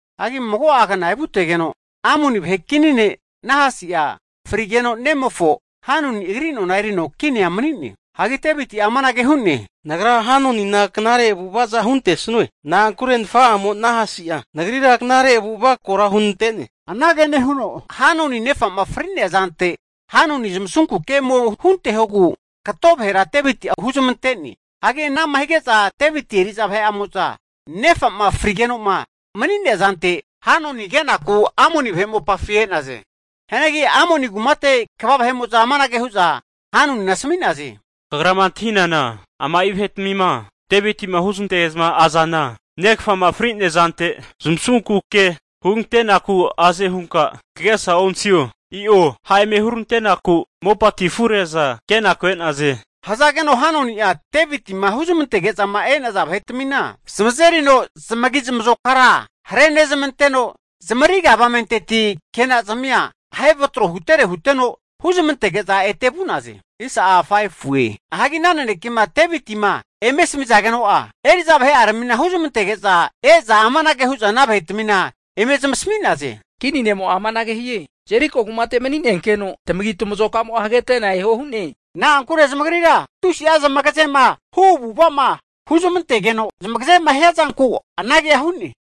Hagi mago'a kna evutegeno, Amoni vahe kini ne' Nahasi'a frigeno nemofo Hanuni agri nona erino kinia mani'ne. Hagi Deviti'a amanage hu'ne, nagra Hanunina knare avu'avaza huntesnue, na'ankure nafa'amo Nahasi'a nagrira knare avu'ava kora hunante'ne. Anage nehuno Hanunina nefa'ma fri'nea zante Hanuni zamasunku ke ome huntehogu kato vahera Deviti'a huzmante'ne. Hagi ana'ma hige'za Deviti eri'za vahe'amo'za nefa'ma frigeno'ma mani'nea zante Hanuni kenaku Amoni vahe mopafi e'naze. Hianagi Amoni kumate kva vahe'mo'za amanage hu'za Hanunina asmi'naze, Kagrama antahinana ama'i vahe'tmima Deviti'ma huzmantege'zma azana, negafa'ma fri'nea zante zamasunku ke hugantenaku aze hunka kagesa antahino? I'o, ha' eme hurante'naku mopatia afure'za kenaku e'naze. Hazageno Hanuni'a Deviti'ma huzmantege'zama e'naza vahetmina zamazerino zamagi zamazokara harenezmanteno, zamariga avamenteti kenazmia ahe vatro hutere huteno huzmantege'za ete vu'naze. Hagi ana nanekema Devitima eme asamizageno'a, eri'za vahe'arami huzmantege'za e'za amanage hu'za ana vahetmina eme zamasami'naze, kini ne'mo'a amanage hie, Jeriko kumate mani'nenkeno tamagitamazoka'mo'a hagetena eho huno hu'ne. Na'ankure zamagrira tusi'a zamagazema hu avu'ava'ma huzmantegeno zamagazema hiazanku anagea hu'ne.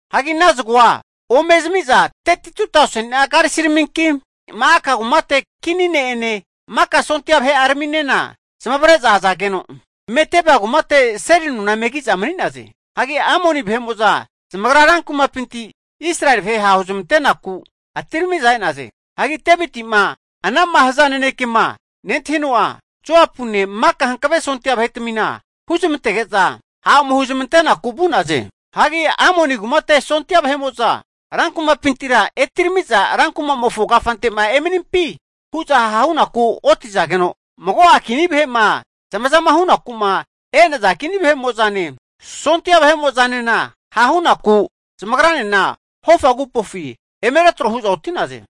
Hagi ana zago'a ome zami'za 32tauseni'a karisiraminki, Ma'aka kumate kini ne'ene maka sondia vahe'araminena zamavare'za e'za, Medeba kumate seli nona eme ki'za mani'naze. Hagi anama nehazage'za Amoni sondia vahe'mo'za zamagra rankumapinti Israeli vahe ha' huzmante'naku atiramiza e'naze. Hagi Deviti'ma ana'ma haza nanekema nentahino'a, Joapune maka hankave sondia vahetmina huzmantege'za ha' ome huzmantenaku vu'naze. Hagi Amoni kumate sondia vahe'mo'za rankumapintira etirami'za rankumamofo kafante emanimpi hu'za ha hunaku otizageno, mago'a kini vahe'mo'zama zamazama hunaku'ma e'naza kini vahe'mo'zane, sondia vahe'mo'zanena hahunaku zamagranena hofa agupofi eme retro hu'za oti'naze.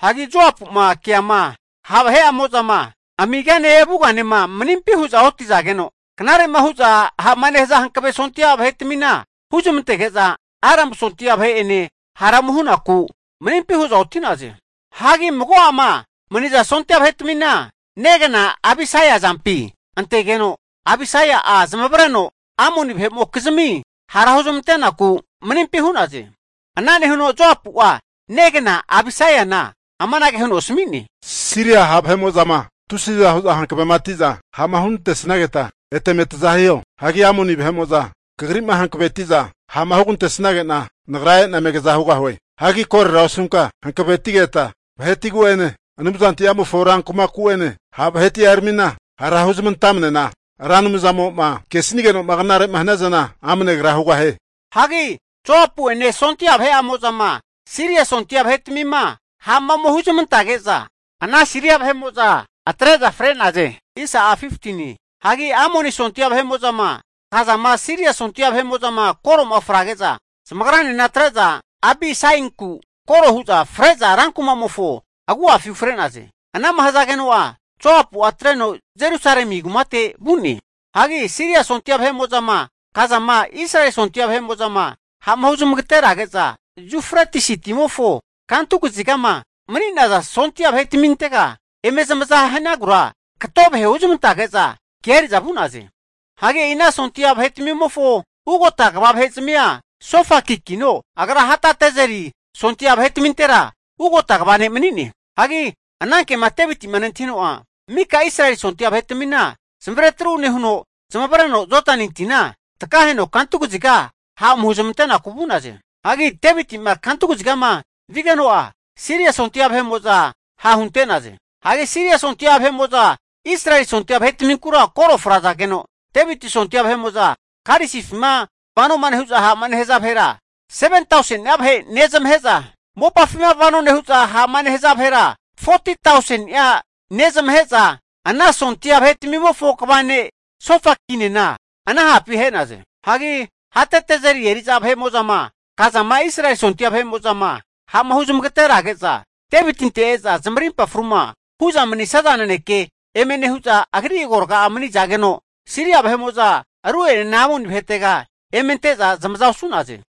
Hagi Joapu'ma keama ha' vahe'amozama amigane avuganema maninpi hu'za otizageno, knare'ma hu'za ha'ma nehaza hankave sondia vahetmina huzmantege'za Aramu sondia vahe'ene hara ome hunaku manimpi hu'za oti'naze. Hagi mago'ama maniza sondia vahetmina negna Abisai azampi antegeno, Abisai'a zamavareno Amoni vahe'mokizmi hara huzmantenaku manimpi hu'naze. Ana nehuno Joapu'a negna Abisaina amanage huno asmi'ne, Siria ha' vahe'mo'zama tusiza hu'za hankavema tiza ha'ma hunante'snageta eta eme naza hiho. Hagi Amoni vahe'mo'zama kagri'ma hankavetiza ha'ma hugantesnagena, nagra e'na eme kaza hugahue. Hagi korora osunka hankavetigeta, vahetiagu'ene Anumzanti'amofo rankumaku'ene ha' vaheti'aramina hara huzmantamnena, Ra Anumzamo'ma kesigenoma knare'ma haniazana amne agra hugahie. Hagi Joapu'ene sondia vahe'amozama Siria sondia vahetmima ha'ma ome huzmantage'za, ana Siria vahe'mo'za atre'za fre'naze. Hagi Amoni sondia vahe'mo'zama kazama Siria sondia vahe'mo'zama koro'ma frage'za, zamagranena atre'za Abisainku koro hu'za fre'za rankumamofo agu'afi ufre'naze. Anama hazageno'a Joapu'a atreno Jerusalemi kumate vu'ne. Hagi Siria sondia vahe'mo'zama kazama, Israeli sondia vahe'mo'zama ha'ma huzmagaterage'za, Yufretisi timofo kantu kazigama mani'naza sondia vahetmintega eme zamazama hanagura kato vahe huzmantazage'za kea eri'za vu'naze. Hagi e'i ana sondia vahetmimofo ugota kva vahezmia Sofakikino, agra Hadadezeri sondia vahetamintera ugota kva ne' mani'ne. Hagi anankema Deviti'ma nentahino'a, mika Israeli sondia vahetmina zamazeri retru nehuno zamavareno Jodani tina takaheno kantu kaziga ha' ome huzmante'naku vu'naze. Hagi Deviti'ma kantu kazigama vigeno'a, Siria sondia vahe'mo'za hahunte'naze. Hagi Siria sondia vahe'mo'za Israeli sondia vahetminkura koro frazageno, Deviti sondia vahe'mo'zama karisifima vano nehu'za ha'ma nehaza vahera 7tauseni'a vahe nezamahe'za, mopafima vano nehu'za ha'ma nehaza vahera 40tauseni'a nezmahe'za, ana sondia vahetmimofo kva ne' Sofakinena ana hapi ahe'naze. Hagi Hadadezeri eri'za vahe'mo'zama kazama Israeli sondia vahe'mo'zama ha'ma huzmagaterazage'za, Devitinte e'za zamarimpa fruma hu'za manisaza naneke eme nehu'za agri agorga'a mani'zageno, Siria vahe'mo'za ru'enena Amoni vahetega eme ante'za zamaza osu'naze.